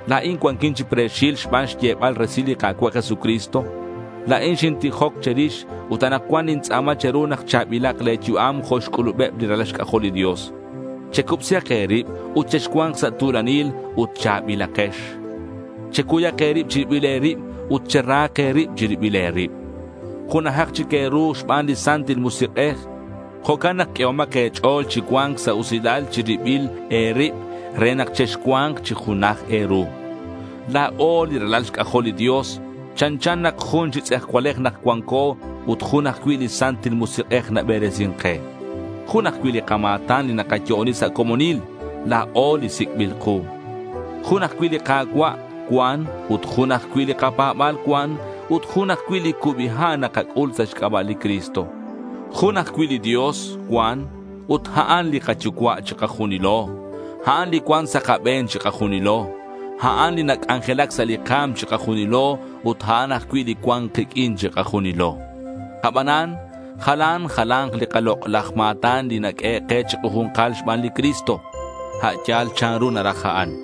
La̱in cuanquin chi pre̱xil xban xyebal resil li Ka̱cua' Jesucristo. La̱in xintijoc che̱rix ut anakcuan nintz'a̱ma che̱ru nak cha̱bilak le̱ yu'am jo' xc'ulubeb li ralal xc'ajol li Dios. Checubsihak e̱rib ut chexcua̱nk sa' tu̱lanil ut cha̱bilakex. Checuyak e̱rib chi ribil e̱rib ut cherahak e̱rib chiribil e̱rib. Junajak chic e̱ru xban li Santil Musik'ej. Jo'can nak q'uehomak e̱ch'o̱l chi cua̱nc sa' usilal chi ribil e̱rib re nak chexcua̱nk chi junaj e̱ru. La̱o li ralal xc'ajol li Dios chanchan nak jun chi tz'ejcualej nak cuanco ut jun ajcui' li Santil Musik'ej naberesin ke. Jun ajcui' li kama̱tan li nakayo'oni sa' comonil, la̱o li sic'bil ku. Jun ajcui' li Ka̱cua' cuan ut jun ajcui' li kapa̱ba̱l cuan ut jun ajcui' li cubi ha' nakac'ul sa' xc'aba' li Cristo. Jun ajcui' li Dios cuan ut a'an li kaYucua' chikajunilo. A'an li cuan sa' kabe̱n chikajunilo. A'an li nac'anjelac sa' li ka̱m chikajunilo ut a'an ajcui' li cuan kiq'uin chikajunilo. Abanan jalan jala̱nk li kalok'laj ma̱tan li naq'uehe' ke chikaju̱nkal xban li Cristo, a' yal chanru naraj a'an.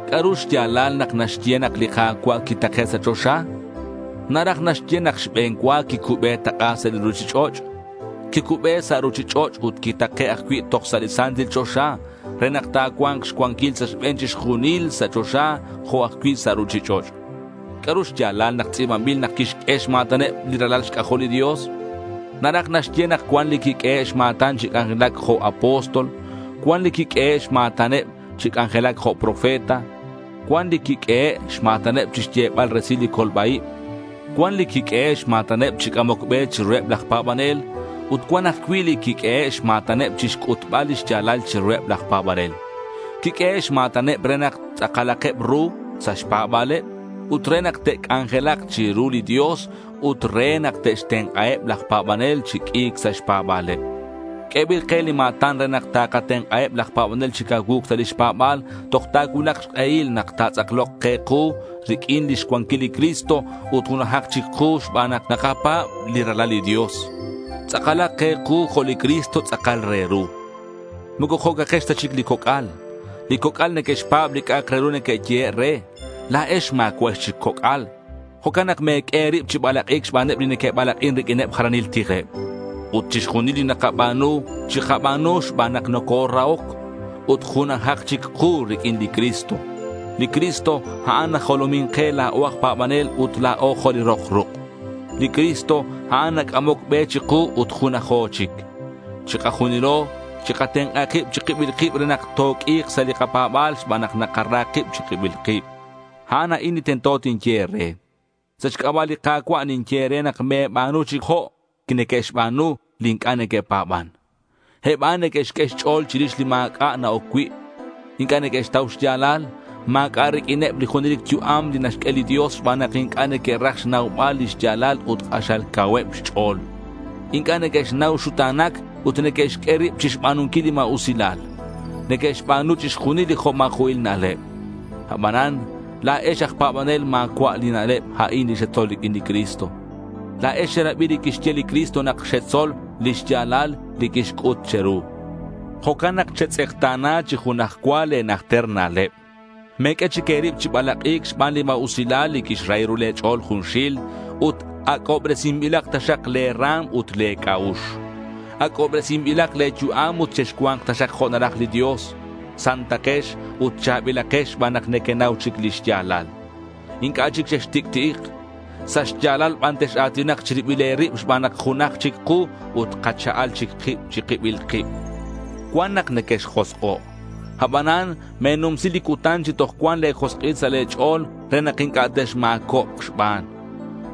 ¿C'a'ru xya̱lal nak naxye nak li Ka̱cua' quitake' sa' choxa? Naraj naxye nak xbe̱n cua quicube tak'a sa' li ruchich'och'. Quicube sa' ruchich'och' ut quitake' ajcui' toj sa' li Santil Choxa re nak ta̱cua̱nk xcuanquil sa' xbe̱n chixjunil sa' choxa jo' ajcui' sa' ruchich'och'. ¿C'a'ru xya̱lal nak tz'i̱banbil nak quixq'ue xma̱taneb li ralal xc'ajol li Dios? Naraj naxye nak cuan li quiq'uehe' xma̱taneb chi c'anjelac jo' apóstol. Cuan li quiq'uehe' xma̱taneb chi c'anjelac jo' profeta. Cuan li quiq'uehe' xma̱taneb chixyebal resil li colba-ib. Cuan li quiq'uehe' xma̱taneb chi c'amoc be chiruheb laj pa̱banel ut cuan ajcui' li quiq'uehe' xma̱taneb chixc'utbal lix ya̱lal chiruheb laj pa̱banel. Quiq'uehe' xma̱taneb re nak tz'akalakeb ru sa' xpa̱ba̱leb ut re nak te'c'anjelak chiru li Dios ut re nak te'xtenk'aheb laj pa̱banel chi q'ui̱c sa' xpa̱ba̱leb. Q'uebil ke li kama̱tan re nak takatenk'aheb laj pa̱banel chi cacuu̱c sa' lix pa̱ba̱leb toj ta̱cuulak xk'ehil nak ta̱tz'aklok ke ku riq'uin lix cuanquil li Cristo ut junajak chic ku xban nak nakapa̱b li Ralal li Dios. Tz'akalak ke ku jo' li Cristo tz'akal re ru. Moco jo'cakex ta chic li coc'al. Li coc'al neque'xpa̱b li c'a'ak re ru neque'yehe' re. La̱ex ma̱cua'ex chic coc'al. Jo'can nak me̱q'ue e̱rib chi balak'i̱c xbaneb li neque'balak'in riq'uin jalanil tijleb. Ut chixjunil li nakaba̱nu, chikaba̱nu xban nak nocorahoc. Ut junajak chic ku riq'uin li Cristo. Li Cristo, a'an najolomin ke la̱o aj pa̱banel ut la̱o jo' li rok ruk'. Li Cristo, a'an nac'amoc be chiku ut junajo chic. Chikajunilo chikatenk'a kib chi kibil kib re nak toq'ui̱k sa' li kapa̱ba̱l xban nak nakara kib chi kibil kib. A'an a'in li tento tinye e̱re. Sa' xc'aba' li Ka̱cua' ninye e̱re nak me̱ba̱nu chic jo' neque'xba̱nu li inc'a' neque'pa̱ban. Eb a'an neque'xq'ue xch'o̱l chirix li ma̱c'a' na-oc cui'. Inc'a' neque'xtau xya̱lal. Ma̱c'a' riq'uineb li junelic yu'am li naxq'ue li Dios xban nak inc'a' neque'raj xnaubal li xya̱lal ut k'axal cauheb xch'o̱l. Inc'a' neque'xnau xuta̱nac ut neque'xq'ue rib chixba̱nunquil li ma̱usilal. Neque'xba̱nu chixjunil li jo' ma̱jo'il aj na'leb. Abanan la̱ex aj pa̱banel ma̱cua' li na'leb a'an li xetzol riq'uin li Cristo. La̱ex xerabi li quixye li Cristo ut xetzol li xya̱lal li quixc'ut che̱ru. Jo'can nak chetz'ekta̱na chi junaj cua le̱ najter na'leb. Me̱q'ue chic e̱rib chi balak'i̱c xban li ma̱usilal li quixrahi ru le̱ ch'o̱l junxil. Ut ac'obresinbilak taxak le̱ ra̱m ut le̱ c'a'ux. Ac'obresinbilak le̱ yu'am ut chexcua̱nk taxak jo' naraj li Dios. Santakex ut cha̱bilakex xban nak nequenau chic li xya̱lal. Inc'a' chic chextic'ti'ik. Sa' xya̱lal ban tex-a̱tinak chi ribil e̱rib xban nak junaj chic ku ut kacha'al chic kib chi kibil kib. Cuan nak nequexjosk'o'. Abanan me̱numsi li cutan chi toj cuan le̱ josk'il sa' le̱ ch'o̱l re nak inc'a' texma̱cobk xban.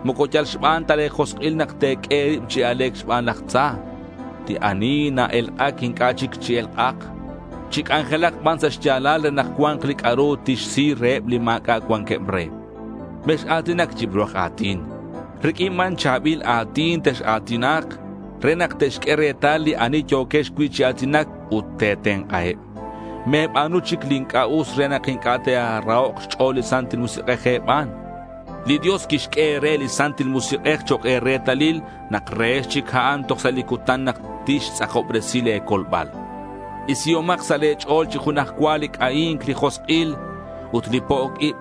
Moco yal xban ta le̱ josk'il nak te̱q'ue e̱rib chi a̱le̱c xban laj tza. Li ani na-elk'ac inc'a' chic chi elk'ac. Chi c'anjelac ban sa' xya̱lal re nak cua̱nk li c'a'ru tixsi reheb li ma̱c'a' cuanqueb re. Mex-a̱tinac yibru aj a̱tin. Riq'uin ban cha̱bil a̱tin tex-a̱tinak re nak te'xq'ue retal li ani yo̱quex cui' chi a̱tinac ut te̱tenk'aheb. Me̱ba̱nu chic li inc'a' us re nak inc'a' ta̱rahok' xch'o̱l li Santil Musik'ej e̱ban. Li Dios quixq'ue e̱re li Santil Musik'ej chok' e̱retalil nak rehex chic a'an toj sa' li cutan nak tixtz'akobresi le̱ colbal. Isihomak sa' le̱ ch'o̱l chi junaj cua li c'ahi̱nc, li josk'il, ut li po'oc ib.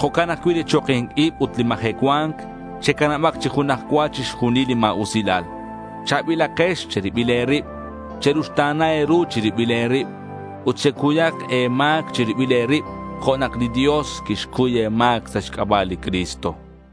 Jo'can ajcui' li choki̱nc ib ut li majecua̱nc. Checanabak chi junaj cua chixjunil li ma̱usilal. Cha̱bilakex che̱ribil e̱rib. Cheruxta̱na e̱ru chi ribil e̱rib. Ut checuyak e̱ma̱c chi ribil e̱rib jo' nak li Dios quixcuy e̱ma̱c sa' xc'aba' li Cristo.